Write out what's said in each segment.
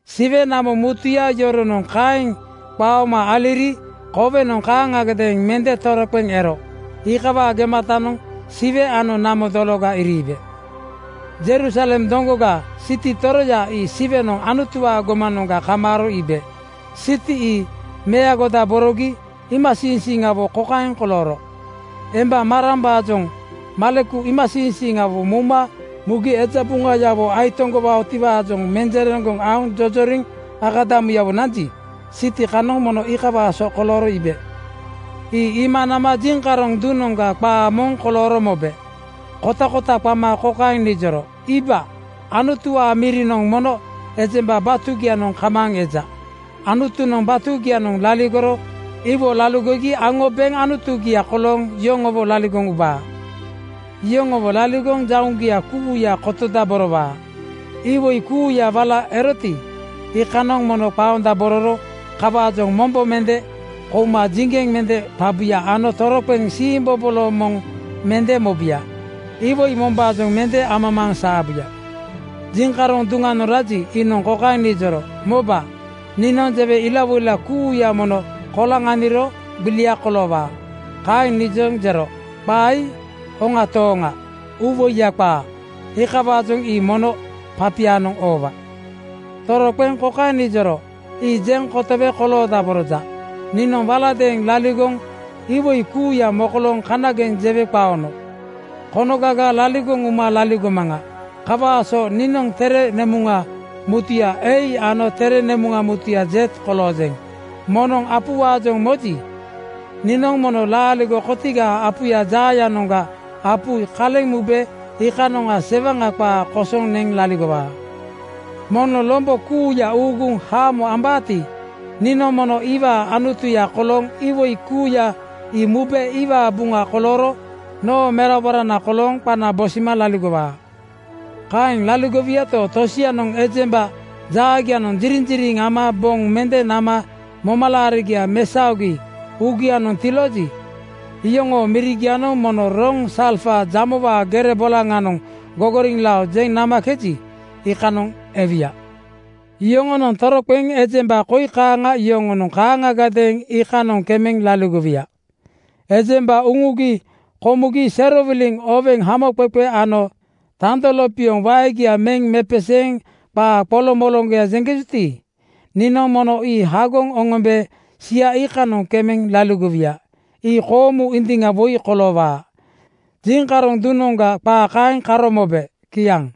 Siwe namo mutuya yoronoŋ kaeŋ qaoma aliri kowenoŋ kaaŋagadeeŋ mende toroqeŋ ero. Iikawaa gematanoŋ Siwe ano namo dologa iriibe. Jerusalem doŋgoga, siti toroya ii Siwenoŋ Anutuwaa gomanoŋga kamaaro iibe. Siti ii meagodaborogi iimasiiŋsiiŋawo kokaeŋ kolooro: Emba marambaajoŋ maleku iimasiiŋsiiŋawo mouma mugi eja buŋayawo aitoŋgowaatiwaajoŋ menjereŋgoŋ aoŋ jojoriŋ akadamuyawo nanji, siti kanoŋ mono iikawaa so kolooro iibe. Ii iima nama jiŋkaroŋ duŋnoŋga qaa moŋ kolooro mobe kotakota qama kokaeŋ nijoro, “Iiba, Anutuwaa mirinoŋ mono ejemba batugianoŋ kamaaŋ eja. Anutunoŋ batugianoŋ laligoro iwo laligogi aŋo beŋ Anutugia kolooŋ yoŋowo laligoŋ ubaa. Yoŋowo laligoŋ jauŋgia kuuya kotodaborowaa. Iwoi kuuya wala eroti, iikanoŋ mono qaondabororo. Kawaajoŋ mombo mende komugi jiŋgeŋ mende qabuya ano toroqeŋ siimbobolo moŋ mende mobuya. Iwoi mombaajoŋ mende amamaaŋ saabuya.” Jiŋkaroŋ duŋanoŋ raji, iinoŋ kokaeŋ nijoro, “Moba, niinoŋ jewe ilawoila kuuya mono koloŋaniro gbilia koloowaa.” Kaeŋ nijoŋ jero, “Qaa ii hoŋa tooŋa uuwoiya qaa, iikawaajoŋ ii mono papianoŋ oowa.” Toroqeŋ kokaeŋ nijoro, “Ii jeŋ kotowe koloodaboroja. Niinoŋ waladeeŋ laligoŋ (iwoi kuuya mokolooŋ kanageŋ jewe qaono) konogaga laligoŋ uma laligomaŋa. Kawaa so niinoŋ tere nemuŋa mutuya A ano tere nemuŋa tetegoya Z koloojeŋ. Moŋnoŋ apuwaajoŋ moji, niinoŋ mono laaligo kotigaa apu jaayanoŋga apu ii kaleŋ mube iikanoŋga sewaŋa qaa kosoŋ neŋ laligowaa. Moŋnoŋ lombo kuuya uuguŋ haamo ambaati, niinoŋ mono iwaa Anutuya kolooŋ iwoi kuuya ii mube iwaa buŋa kolooro noo meraborana kolooŋ qana bosima laligowaa. “Kaeŋ laligowuyato, tosianoŋ ejemba jaagianoŋ jiriŋjiriŋ ama boŋ mende nama momalaarigia mesaogi uugianoŋ tilooji, iyoŋoo mirigianoŋ mono roŋ salfa jamowaa gere bolaŋanoŋ gogoriŋlao jeŋ namakeji, iikanoŋ ewuya. Yoŋoonoŋ toroqeŋ ejemba koi kaaŋa yoŋonoŋ kaaŋagadeeŋ iikanoŋ kemeŋ laligowuya: Ejemba uŋugi komugi serowiliŋ oweŋ hamoqeqe ama tando lopioŋ waegia meŋ mepeseeŋ qaa qoloŋmoloŋgoya jeŋkejuti, niinoŋ mono ii hagoŋ oŋombe sia iikanoŋ kemeŋ laligowuya. Ii koomu indiŋa woi koloowaa.” Jiŋkaroŋ duŋanoŋga qaa kaeŋ karo mobe. Kiaŋ.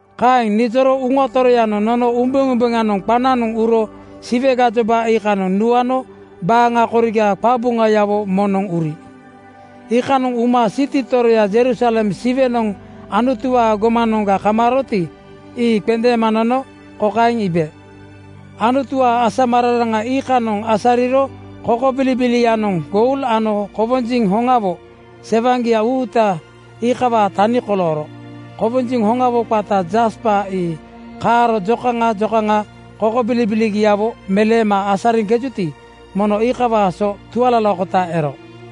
Kaeŋ nijoro Uŋa Toroyanoŋ nono umbeumbeŋanoŋ qananoŋ uro Siwe gajoba iikanoŋ nuano baaŋa koriga qabuŋayawo moŋnoŋ uri. Iikanoŋ uma siti toroya Jerusalem Siwenoŋ Anutuwaa gomanoŋga kamaaroti, ii qendeema nono kokaeŋ iibe: Anutuwaa asamararaŋa iikanoŋ asariro kokobilibilianoŋ goul ano kowonjiŋ hoŋawo sewaŋgia uuta iikawaa tani kolooro. Kowonjiŋ hoŋawo qata jaspa ii kaaro jokaŋa jokaŋa kokobilibiligiawo meleema asariŋkejuti, mono iikawaa so tualalakota ero.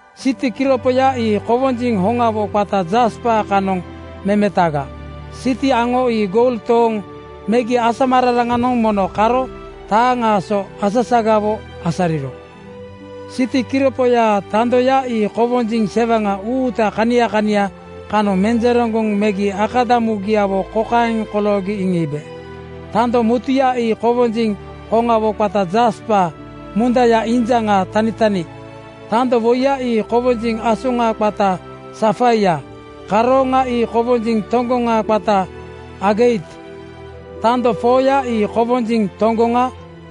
Siti kiropoya ii kowonjiŋ hoŋawo qata jaspa kanoŋ memetaga. Siti aŋo ii goul toonoŋ megi asamararaŋanoŋ mono kaaro taaŋaa so asasagawo asariro. Siti kiropoyaa tandoya ii kowonjiŋ sewaŋa uuta kania kania kanoŋ menjereŋgoŋ megi akadamugiawo kokaeŋ koloogi iŋiibe: Tando mutuya ii kowonjiŋ hoŋawo qata jaspa mundaya injaŋa tanitani. Tando woiya ii kowonjiŋ asoŋa qata safaia, karooŋa ii kowonjiŋ toŋgoŋtoŋgoŋ qata ageit. Tando 4:ya ii kowonjiŋ toŋgoŋa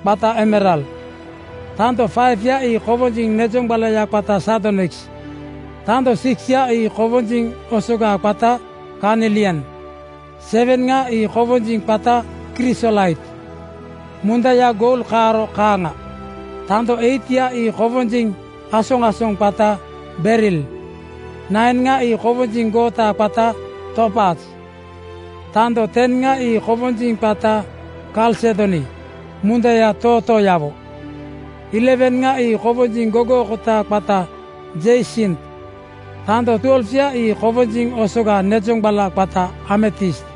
qata emerald. Tando 5:ya ii kowonjiŋ nejoŋgbalaya qata sardoniks. Tando 6:ya ii kowonjiŋ osoga qata karnilian, 7:ŋa ii kowonjiŋ qata krisolait (kwortz), mundaya goul kaaro kaaŋa. Tandoya 8:ya ii kowonjiŋ asoŋasoŋa qata beril, 9:ŋa ii kowonjiŋ goota qata topaz. Tando 10:ŋa ii kowonjiŋ qata kalsedoni (krisopreis) mundaya tootooyawo, 11:ŋa ii kowonjiŋ gogookota qata jeisint (torkwois). Tando 12:ya ii kowonjiŋ osoga nezoŋgbala qata ametist.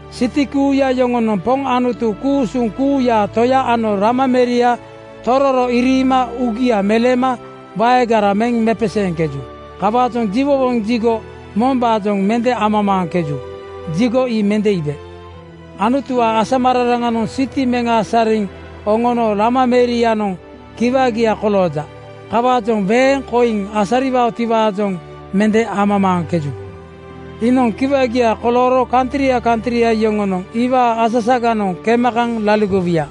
Siti kuuya yoŋonoŋ Poŋ Anutu ku-usuŋ kuuyaa Toya ano Lama meria tororo iriima uugia meleema waegara meŋ mepeseeŋkeju. Kawaajoŋ jiwowoŋ jigo (tempel) mombaajoŋ mende amamaaŋkeju. Jigo ii mende iibe. Anutuwaa asamararaŋanoŋ siti meŋ asariŋ oŋono Lama merianoŋ kiwagia kolooja. Kawaajoŋ weeŋ koiŋ asariwaotiwaajoŋ mende amamaaŋkeju. Iinoŋ kiwagia kolooro kantria kantria yoŋonoŋ iwaa asasaganoŋ kema kaŋ laligowuya.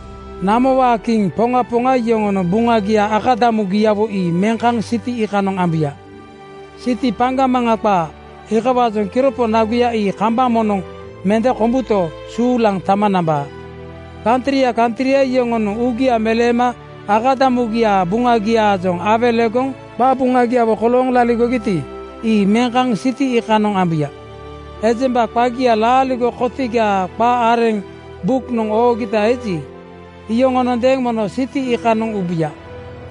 Namowaa kiŋ poŋa poŋa yoŋonoŋ buŋagia akadamugiawo ii meŋ kaŋ siti iikanoŋ ambuya. Siti paŋgamaŋa qaa, iikawaajoŋ kiropo naguya ii kambaŋ moŋnoŋ mende kombuto, suulaŋ tama nambaa. Kantria kantria yoŋonoŋ uugia meleema akadamugiaa buŋagiaajoŋ awelegoŋ qabuŋagiawo kolooŋ laligogiti, ii meŋ kaŋ siti iikanoŋ ambuya. Ejemba qagia laaligo kotigaa qa areŋ buknoŋ oogita eji, iyoŋonondeeŋ mono siti iikanoŋ ubuya.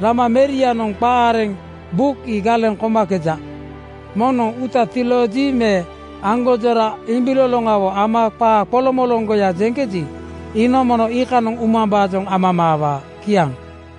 Lama merianoŋ qa areŋ buk ii galeŋ komakeja. Moŋnoŋ uuta tilooji me aŋgonjora imbiloloŋawo ama qaa qoloŋmoloŋgoya jeŋkeji, iinoŋ mono iikanoŋ umambaajoŋ amamaawaa. Kiaŋ.